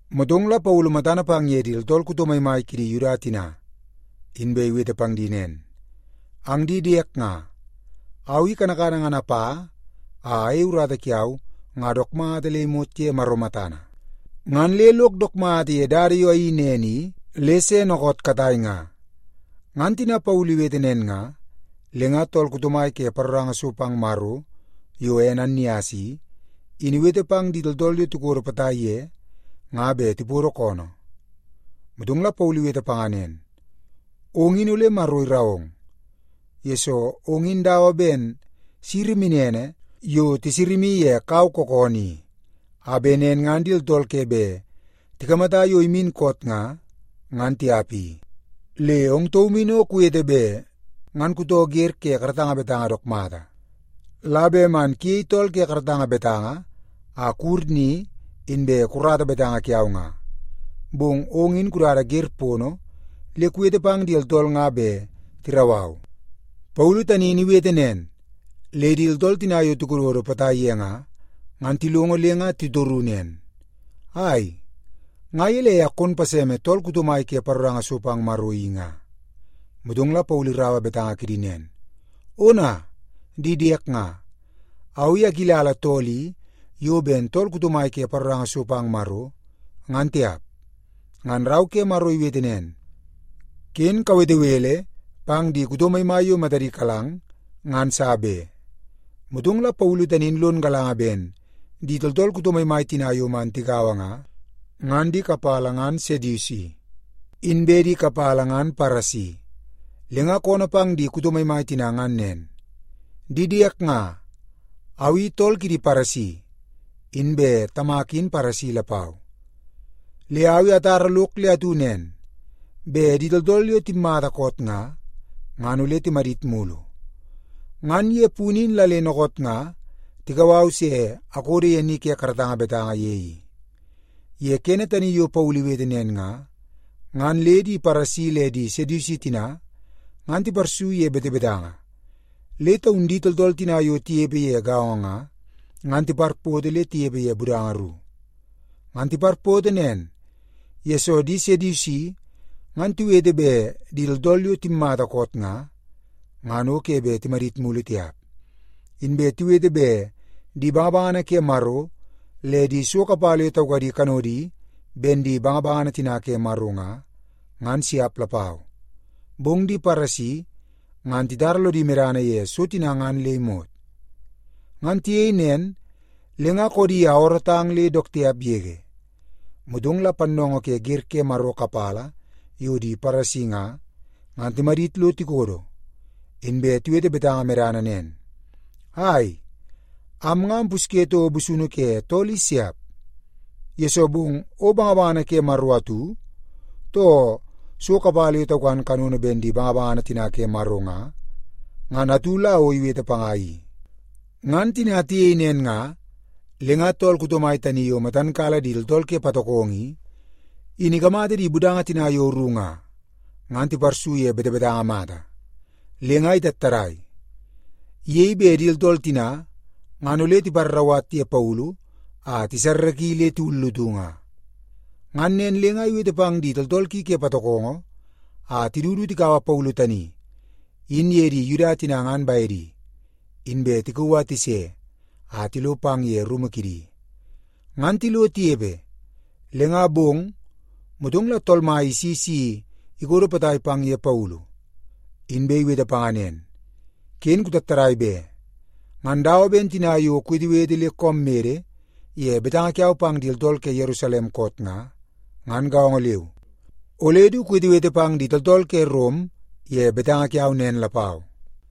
Motong la Paulu matana pang ye di tooltool kuto maimai kidi Yuda tina, inbe iwete pang di nen, “Ang di diek nga, au i kanakana ngan apa a ayei urata kiau nga dook mata le imot ye Maro matana, ngan le lok dook mata ye dada yo ayeii nen i le se dookoot katai nga.” Ngan tina Paulu iwete nen nga, le nga tool kuto mai ke paroranga so pang Maro yo ene Annias i, in iwete pang di tooltool yo tikodo potai ye nga bet tipodo koonoo. Motong la Paulu iwete panga nen, “Ong in ole Maro irau ong, yesoo ong in dawa ben siri minene yo tisama ye kau kookoonoo i, a bet nen ngan di tooltool ke bet tikamata yo imin koot nga, ngan tiap i. Le ong taum in o kuwete bet ngan kutoo wer ke karatanga betanga dook mata, la bet man kuyei tool ke karatanga betanga a kuwur ni inbe kukarata betanga kiau nga, bong ong in kudada wer pono le kuwete pang di tooltool nga bet tirau au.” Paulu tani in iwete nen, le di tooltool tina yo tikododo potai ye nga, ngan tilongo le nga titoru nen, “Ai, nga gelei a kon paseme tool kuto mai ke paroranga so pang Maro i nga?” Motong la Paulu iraua betanga kidi nen, “Ona, di diek nga, au i akilala tool i yo ben tool kuto mai ke paroranga so pang Maro, ngan tiap. Ngan Rau ke Maro iwete nen, ‘Ken kawete bele pang di kuto maimai yo matadi kalang, ngan sa be.’” Motong la Paulu tani in lon galanga ben di tooltool kuto maimai tina yo man tigaua nga, ngan di kapala ngan Sedusi, inbe di kapala ngan Paresi. Le nga koonoo pang di kuto maimai tina ngan nen, “Di diek nga, au i tool kidi Paresi, inbe tamak in Paresi lapau. Le au i atar lok le atu nen, bet di tooltool yo timmata koot nga, ngan ole timadit mulu. Ngan ye punu in la le dookoot nga tikau au se akodo ye ni ke karatanga betanga ye i.” Ye kene tani yo Paulu iwete nen nga, ngan le di Paresi le di Sedusi tina ngan tiparsu ye betebetanga, le taun di tooltool tina yo tinepe ye gaongo nga, ngan tiparpoto le tinepe ye budanga ru. (Ngan tiparpoto nen, yesoo di Sedusi ngan tiwete bet di tooltool yo timmata koot nga, ngan o ke bet timadit mulu tiap. Inbe tiwete bet di bangabangana ke Maro le di so kapala yo taukadi kanodi ben di bangabangana tina ke Maro nga, ngan siap lapau. Bong di Paresi ngan titara lodi medana ye so tina ngan le imot.) Ngan tiyei nen, le nga koodi a oorootang le dook tiap yege. Motong la pannoongoo ke wer ke Maro kapala yo di Paresi nga, ngan timadit lo tikodo, inbe tiwete betanga medana nen, “Ai, am nga ampusye toko busunu ke tool i siap, yesoo bong o bangabangana ke Maro atu, too so kapala yo taukan kanono ben di bangabangana tina ke Maro nga, ngan atu la o iwete panga i.” Ngan tina tiyei nen nga, le nga tool kuto mai tani yo matan kala di tooltool ke patokongo i, in ikamata di budanga tina yo ru nga, ngan tiparsu ye betebetanga mata, le nga itattadai. Iyei bet nen ngan di tooltool tina ngan ole tiparrauwat ye Paulu a tisarraki le tiwullutu nga. Ngan nen le nga iwete pang di tooltool ki ke patokongo a tidu du tikaua Paulu tani in ye di Yuda tina ngan bedi, inbe tikauu a tise a tilo pang ye rumu kidi. Ngan tilo tinepe, le nga bong, motong la Tool Mai isi si ikodo potai pang ye Paulu, inbe iwete panga nen, “Ken kutattadai be! Ngan dawa ben tina yo kuwetewete le koom mede ye betanga kiau pang di tooltool ke Yerusalem koot nga, ngan gaongo leu, ole du kuwetewete pang di tooltool ke Rom ye betanga kiau nen lapau.”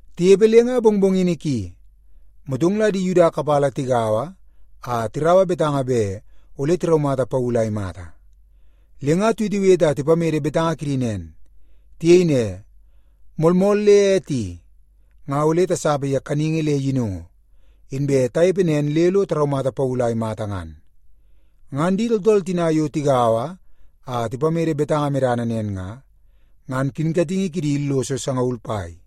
Tinepe le nga mongmongini ki, motong la di Yuda kapala tigaua a tiraua betanga bet ole tiraumata Paulu a imata. Le nga tiwetewete a tipamede betanga kidi nen. Tiyei ne, “Moolmool le ete i, nga ole tasapa ye kaningi le yinungu, inbe tanepe nen le lo taraumata Paulu a imata ngan.” Ngan di tooltool tina yo tigaua a tipamede betanga medana nen nga, ngan kinkatingi kidi illoso sangaul pai.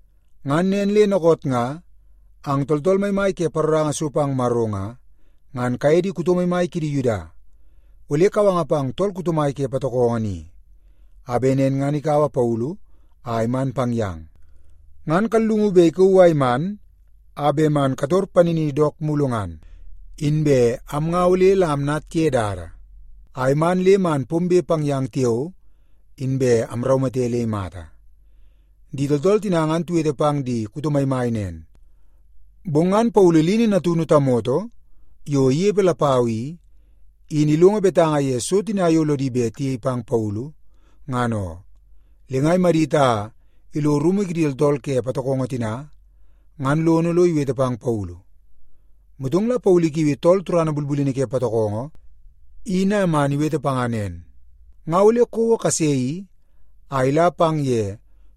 Ngan nen le dookoot nga, ang tooltool maimai ke paroranga so pang Maro nga, ngan kaye di kuto maimai kidi Yuda ole kawanga pang tool kuto mai ke patokongo ni, a bet nen ngan ikaua Paulu a iman pang yang. Ngan kallungu bet ikauu a iman a bet man kator panini dook mulu ngan. Inbe am nga ole la amnat ye dada a iman le man pombe pang yang tiao, inbe amraumate le imata.” Di tooltool tina ngan tiwete pang di kuto maimai nen, bong ngan Paulu lini natunu tamoto yo inepe lapau i, in ilongo betanga ye so tina yo lodi bet tiyei pang Paulu, ngan oo. Le nga imadit a ilo rumu kidi tooltool ke patokongo tina ngan lono lo iwete pang Paulu. Motong la Paulu ikiui tool turana bulbulini ke patokongo in a man iwete panga nen, “Nga ole kouo tamoto kase i a ila pang ye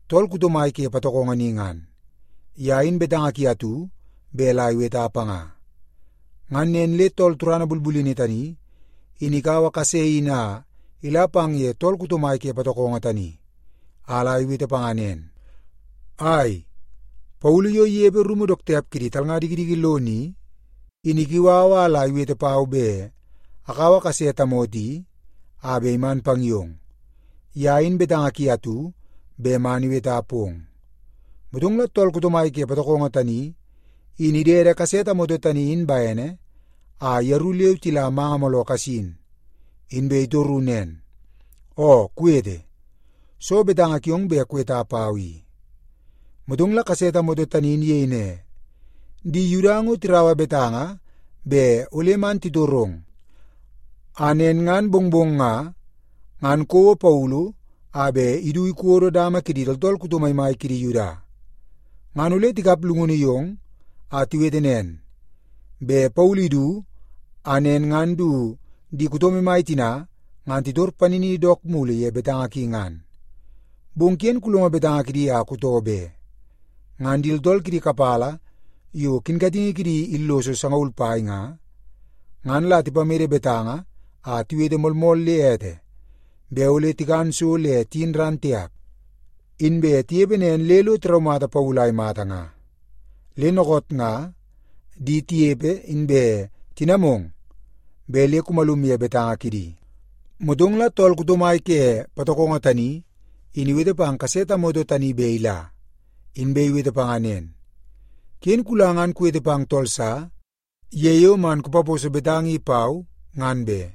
tool kuto mai ke patokongo ni ngan. Ye in betanga ki atu bet la iweta panga.” Ngan nen le tool turana bulbulini tani, in ikaua kase in a ila pang ye tool kuto mai ke patokongo tani, a la iwete panga nen, “Ai, Paulu yo inepe rumu dook tiap kidi talnga dikidiki lono i, in ikiu au la iwete pau bet akaua kase tamoto i a bet iman pang yong. Ye in betanga ki atu bet man iweta pong.” Motong la tool kuto mai ke patokongo tani, in idede kase tamoto tani in bene a yeru leu tila manga mooloo kasin, inbe itoru nen, “Oo, kuwete. Soo betanga kiong bet kuweta pau i?” Motong la kase tamoto tani in iyei ne, “Di Yuda ngo tiraua betanga bet ole man titorong a nen ngan mongmong nga, ngan kouo Paulu a bet idu ikodo dama kidi tooltool kuto maimai kidi Yuda. Ngan ole tikap llungunu yong a tiwete nen, bet Paulu idu a nen ngan du di kuto maimai tina ngan titor panini dook mulu ye betanga ki ngan. Bong ken kulongo betanga kidi a kutoo be. Ngan di tooltool kidi kapala yo kinkatingi kidi illoso sangaul pai nga, ngan la tipamede betanga a tiwete moolmool le ete, bet ole tikan so le tiyin ran tiap, inbe tinepe nen le lo tiraumata Paulu a imata nga. Le dookoot nga di tinepe inbe tinamong bet le kumalum ye betanga kidi.” Motong la tool kuto mai ke patokongo tani in iwete pang kase tamoto tani bet ila, inbe iwete panga nen, “Ken kula ngan kuwete pang tool sa ye yo man kupaposo betanga i pau, ngan be.”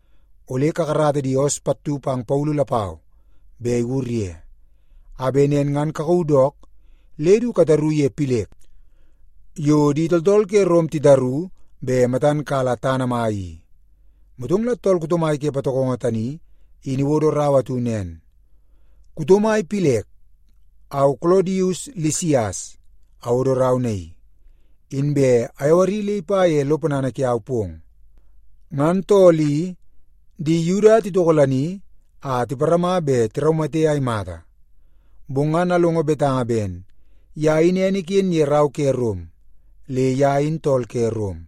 Ole kakarata di oos pattu pang Paulu lapau bet iwur ye, a bet nen ngan kakauu dook le du kataru ye Pilek yo di tooltool ke Rom titaru bet matan kala tana mai i.” Motong la tool kuto mai ke patokongo tani in iwodo rau atu nen, Kuto mai Pilek, au Kolodius Lisias awodo rau naii, inbe ayawari le ipa ye lo ponana kiau pong. Ngan tool i, di Yuda titokolani a tiparama bet tiraumate a imata. Bong ngan alongo betanga ben ye in ene iken ye rau ke Rom le ye in tool ke Rom,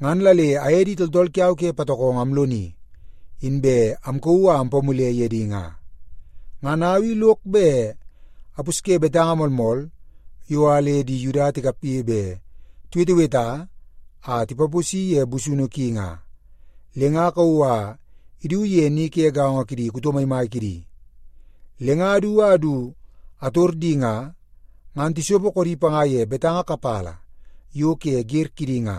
ngan la le aye di tooltool kiau ke patokongo amloni, inbe amkauu a ampamule ye di nga. Ngan au i lok bet apusye betanga moolmool yo a le di Yuda tikapge bet tiweteweta a tipaposi ye busunu ki nga, le nga akauu a idu ye ni ke gaongo kidi kuto maimai kidi. Le nga adu a du ator di nga, ngan tisopo koodi panga ye betanga kapala yo ke wer kidi nga.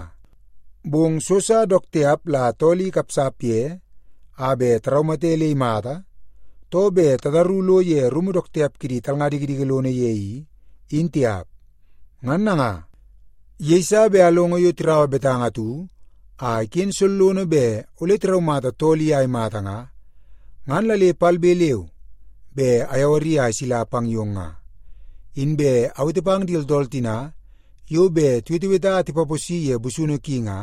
Bong so sa dook tiap la tool i ikapsap ye a bet taraumate le imata, too bet tataru lo ye rumu dook tiap kidi talnga dikidiki lono ye i, in tiap. Ngan nanga, yeiso bet alongo yo tiraua betanga atu a iken sollono bet ole tiraumata tool i a imata nga, ngan la le palbe leu be ayawari a isila pang yong nga. Inbe awete pang di tooltool tina yo bet tiweteweta a tipaposi ye busunu ki nga,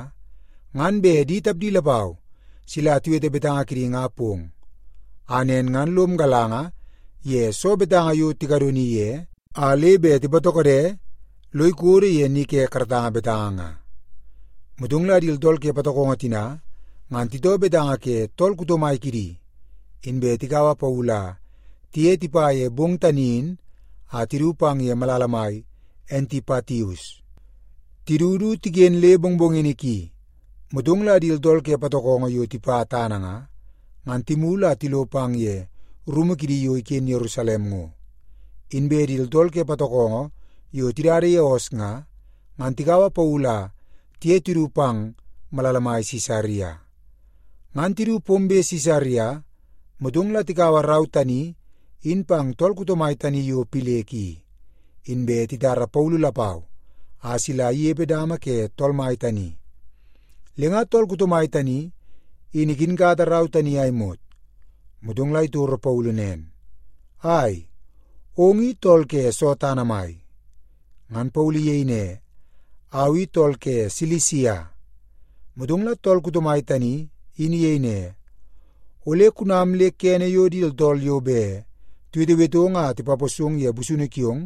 ngan bet di tapdi lapau sila tiwete betanga kidi nga pong, a nen ngan lom galanga ye soo betanga yo tikadoni ye, a le bet tipatokode lo ikodo ye ni ke karatanga betanga nga. Motong la di tooltool ke patokongo tina ngan titoo betanga ke tool kuto mai kidi, inbe tikaua Paulu a tiye tipa ye bong tani in a tidu pang ye malala mai Antipatius. Tidu du tiken le mongmongini ki, motong la di tooltool ke patokongo yo tipa tana nga, ngan timulu a tilo pang ye rumu kidi yo iken Yerusalem ngo. Inbe di tooltool ke patokongo yo tidada ye oos nga, ngan tikaua Paulu a tiye tidu pang malala mai Sisaria. Ngan tidu pombe Sisaria, motong la tikaua rau tani in pang tool kuto mai tani yo Pilek i, inbe titara Paulu lapau a sila inepe dama ke tool mai tani. Le nga tool kuto mai tani in ikinkata rau tani a imot, motong la itoro Paulu nen, “Ai, ong i tool ke soo tana mai?” Ngan Paulu iyei ne, “Au i tool ke Silisia.” Motong la tool kuto mai tani in iyei ne, “Ole kunam le kene yo di tooltool yo bet tiwetewetong a tipaposong ye busunu kiong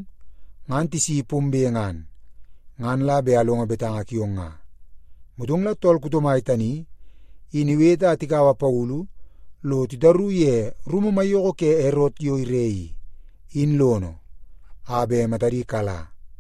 ngan tisi pombe ngan, ngan la bet alongo betanga kiong nga.” Motong la tool kuto mai tani in iwete a tikaua Paulu lo titaru ye rumu maiyoko ke Erot yo ire i, in lono, a bet matadi kala.